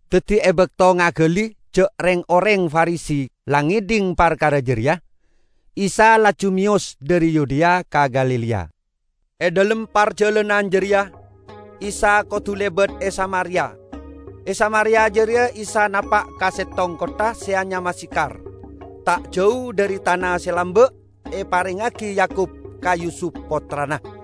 Daddi e bakto ngagali ja' reng-oreng Farisi la ngedhing parkara jareya, Isa laju meyos dhari Yudea ka Galilea. E dhalem parjalanan jareya Isa kodu lebat e Samaria. E Samaria jareya Isa napa' ka settong kottha se anyama Sikhar, ta' jau dhari tana se lamba' eparengngagi Yakub ka Yusup pottrana.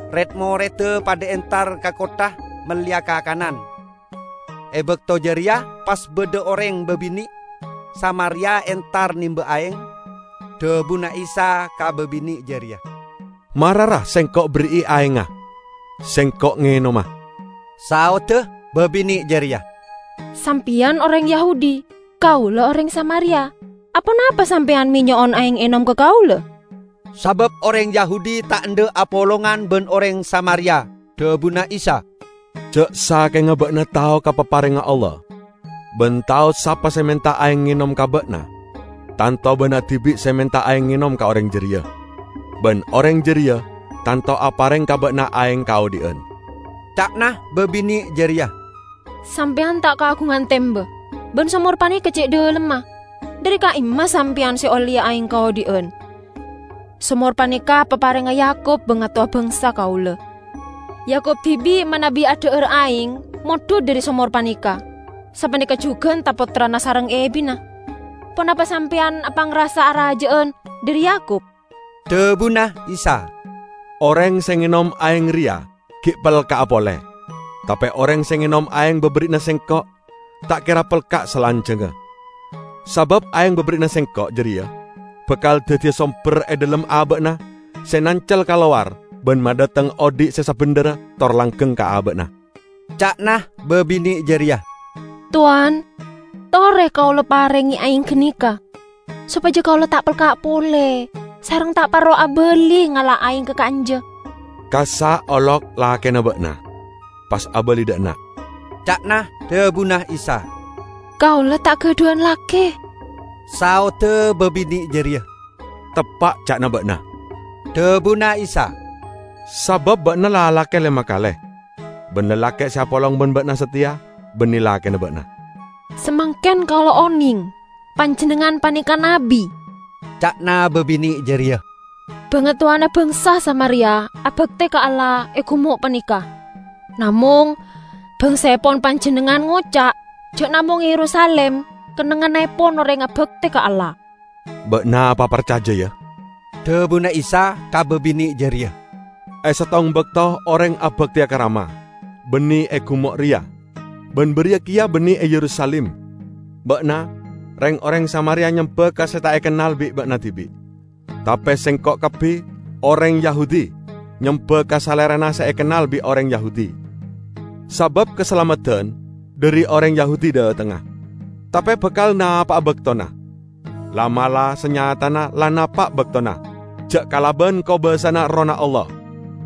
red-moredda padha entar ka kottha melleya kakanan. E bakto jareya pas badha oreng babine' Samaria entar nemba aeng. Dhabuna Isa ka babine' jareya, "Mara, ra, Sengko' berri'i aengnga, Sengko' ngenoma." Saodda babine' jareya, "Sampeyan oreng Yahudi, kaula oreng Samaria; aponapa Sampeyan me' nyo'on aeng enom ka kaula?" (Sabab oreng Yahudi ta' endha' apolongan ban oreng Samaria.) Dhabuna Isa, "Ja' sakenga ba'na tao ka paparengnga Allah ban tao sapa se menta aeng enom ka ba'na, tanto ba'na dibi' se menta aeng enom ka oreng jareya, ban oreng jareya tanto apareng ka ba'na aeng kaodhi'an." Ca'na babine' jareya, "Sampeyan ta' kaagungan temba, ban somor paneka ce' dhalemma. Dhari ka'imma Sampeyan se olleya aeng kaodhi'an? Somor paneka paparengnga Yakub bangatowa bangsa kaula. Yakub dibi' manabi adha'ara aeng mondhut dhari somor paneka; Sapaneka jugan tra-pottrana sareng ebinna. Ponapa Sampeyan apangrasa araja'an dhari Yakub?" Dhabuna Isa, "Oreng se ngenom aeng reya gi' pelka'a pole. Tape oreng se ngenom aeng baberri'na Sengko' ta' kera pelka' salanjangnga. Sabab aeng baberri'na Sengko' jareya bakal daddiya somber e dhalem aba'na se nancel kalowar ban madhateng odhi' se sabendherra tor langgeng ka aba'na." Ca'na babine' jareya, "Towan, tore kaula parenge aeng ganeka, sopaja kaula ta' pelka' pole, sareng ta' parlo abali ngala' aeng ka ka'anja." "Kassa' olok lakena ba'na, pas abali dha' enna'," ca'na dhabuna Isa. "Kaula ta' gadhuwan lake," saodda babine' jareya. "Teppa' ca'na ba'na," dhabuna Isa. "Sabab ba'na la alake lema kale, ban lalake' se apolong ban ba'na sateya banne lakena ba'na." "Samangken kaula oneng, Panjennengngan paneka nabbi," ca'na babine' jareya. "Bangatowana bangsa Samaria abakte ka Allah e gumo' paneka, namong bangsaepon Panjennengngan ngoca' ja' namong e Yerusalim kennengngannepon oreng abakte ka Allah." "Ba'na paparcaja, ya," dhabuna Isa ka babine' jareya, "E settong bakto oreng abakteya ka Rama, banne e gumo' reya, ban bariya keya banne e Yerusalim. Ba'na, reng-oreng Samaria nyemba ka se ta' ekennal bi' ba'na dibi', tape Sengko' kabbi, oreng Yahudi, nyemba ka Salerana se ekennal bi' oreng Yahudi, sabab kasalameddan dhari oreng Yahudi dhatengnga. Tape bakal napa'a baktona, la'-mala' sanyatana la napa' baktona, ja' kalaban kobasana Errohna Allah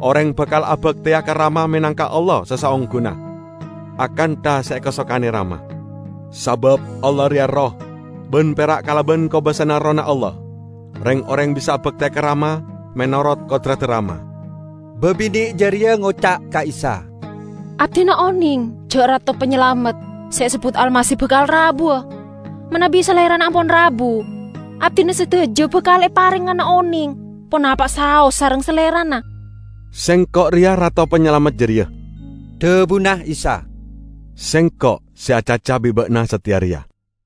oreng bakal abakteya ka Rama menangka Allah se saongguna akantha se ekasokane Rama. Sabab Allah reya Erroh, ban pera' kalaban kobasana Errohna Allah reng-oreng bisa abakte ka Rama menorot kodradda Rama." Babine' jareya ngoca' ka Isa, "Abdina oneng ja' Rato Panyalamet (se esebbut Almasih) bakal rabuwa. Manabi Salerana ampon rabu, abdina sadaja bakal eparengngana oneng ponapa'a saos sareng Salerana." "Sengko' reya Rato Panyalamet jareya," dhabuna Isa, "Sengko' se acaca bi' ba'na sateya reya."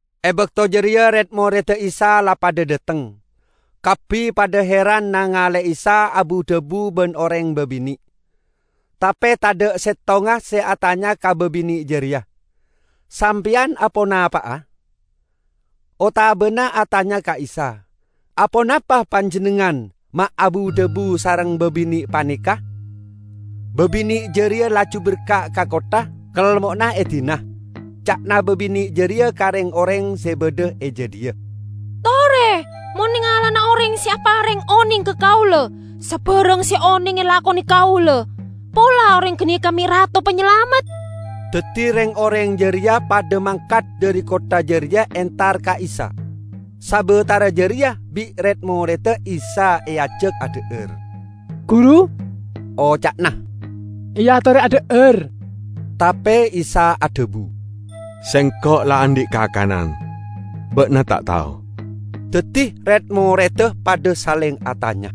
E bakto jareya red-moredda Isa la padha dhateng. Kabbi padha heran nangale'e Isa abu-dhabu ban oreng babine'. Tape tadha' settonga se atanya ka babine' jareya, "Sampeyan aponapa'a?" otabana atanya ka Isa, "Aponapa Panjennengngan me' abu-dhabu sareng babine' paneka?" Babine' jareya laju berka' ka kottha, kelmo'na edina. Ca'na babine' jareya ka reng-oreng se badha e jadhiya, "Tore mon nengalana oreng se apareng oneng ka kaula sabarang se oneng elakone kaula. Pola oreng ganeka me' Rato Panyalamet?" Daddi reng-oreng jareya padha mangkat dhari kottha jareya entar ka Isa. Sabatara jareya bi' red-moredda Isa eajak adha'ar. "Guru," oca'na, "eatore adha'ar." Tape Isa adhabu, "Sengko' la andhi' kakanan, ba'na ta' tao." Daddi red-moredda padha saleng atanya,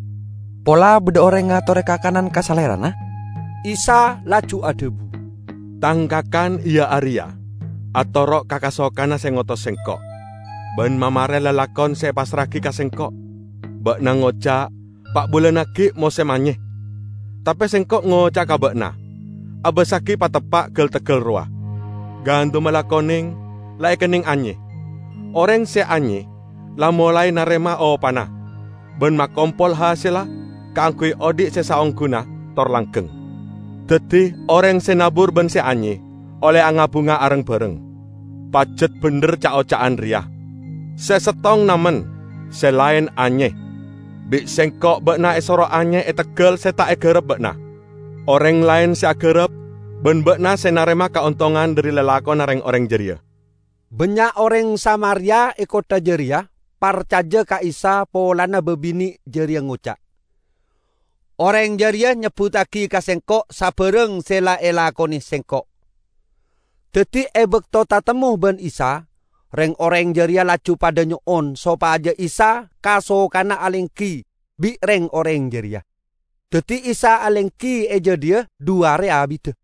"Pola badha oreng ngatore kakanan ka Salerana." Isa laju adhabu, "Tang kakan iya areya atoro' ka kasokanna se ngotos Sengko', ban mamare lalakon se epassra'agi ka Sengko'. Ba'na ngoca', 'Pa' bulan aggi' mosem anye.' Tape Sengko' ngoca'a ka ba'na: abassagi pateppa' gal-teggal rowa; gandumma la koneng, la ekenneng anye! Oreng se anye la molae narema opana ban makompol hasella kaangguy odhi' se saongguna tor langgeng. Daddi oreng se nabur ban se anye olle anga-bunga areng-bareng. Pajat bendher ca'-oca'an reya: 'Se settong namen, se laen anye.' Bi' Sengko' ba'na esoro anye e teggal se ta' egarap ba'na; oreng laen se agarap, ban ba'na se narema kaontongan dhari lalakonna reng-oreng jareya." Bannya' oreng Samaria e kottha jareya parcaja ka Isa polana babine' jareya ngoca', "Oreng jareya nyebbuttagi ka sengko' sabarang se la elakone sengko'." Daddi e bakto tatemmo ban Isa, reng-oreng jareya laju padha nyo'on sopaja Isa kasokana alenggi bi' reng-oreng jareya. Daddi Isa alenggi e jadhiya dhu are abidda.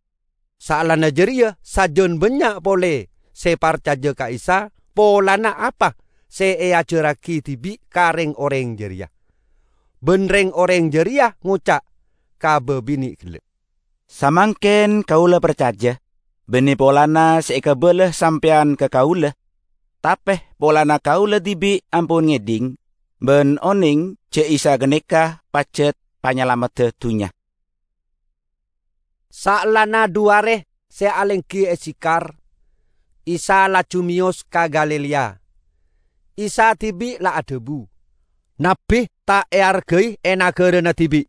Saellana jareya sajan bannya' pole se parcaja ka Isa polana apa se eajarragi dibi' ka reng-oreng jareya. Ban reng-oreng jareya ngoca' ka babine' gella', "Samangken kaula parcaja, banne polana se ekabala sampeyan ka kaula, tape polana kaula dibi' ampon ngedhing, ban oneng ja' Isa ganeka pajat Panyalamedda Dunnya." Saellana dhu are se alenggi e Sikhar, Isa laju meyos ka Galilea. Isa dibi' la adhabu, "Nabbi ta' eargai e nagarana dibi'."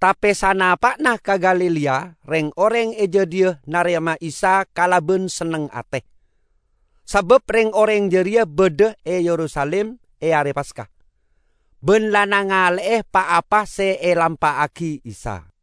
Tape sanapa'na ka Galilea reng-oreng e jadhiya narema Isa kalaban senneng ate, sabab reng-oreng jareya badha e Yerusalim e Are Paska, ban la nangale'e pa-apa se elampa'agi Isa.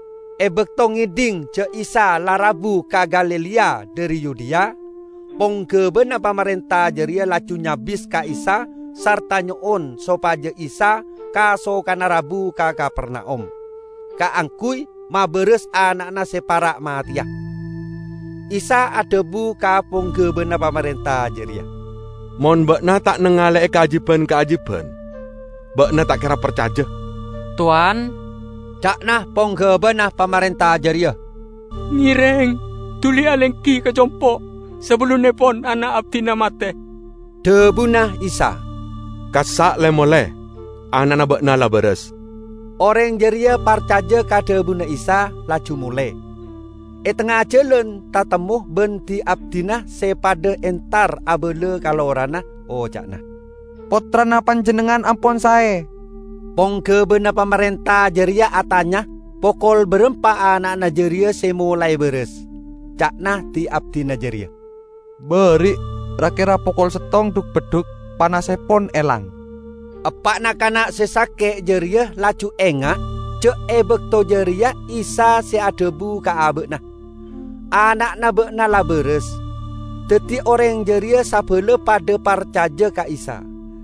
E bakto ngedhing ja' Isa la rabu ka Galilea dhari Yudea, ponggabana pamarenta jareya laju nyabis ka Isa sarta nyo'on sopaja Isa kasokana rabu ka Kapernaum kaangguy mabaras ana'na se para' mateya. Isa adhabu ka ponggabana pamarenta jareya, "Mon ba'na ta' nangale'e kaajiban-kaajiban, ba'na ta' kera parcaja." "Towan," ca'na ponggabana pamarenta jareya, "ngereng duli alenggi ka compo' sabellunnepon ana' abdina mate." Dhabuna Isa, "Kassa' le-mole, ana'na ba'na la baras." Oreng jareya parcaja ka dhabuna Isa, laju mole. E tengnga jalan tatemmo ban di-abdina se padha entar abala ka lorana, oca'na, "Pottrana panjennengngan ampon sae." Ponggabana pamarenta jareya atanya pokol barampa ana'na jareya se molae baras. Ca'na di-abdina jareya, "Ba'ari' ra-kera pokol settong dhuk-beddhuk panassepon elang." Eppa'na kana' se sake' jareya laju enga' ja' e bakto jareya Isa se adhabu ka aba'na, "Ana'na ba'na la baras." Daddi oreng jareya sabala padha parcaja ka Isa.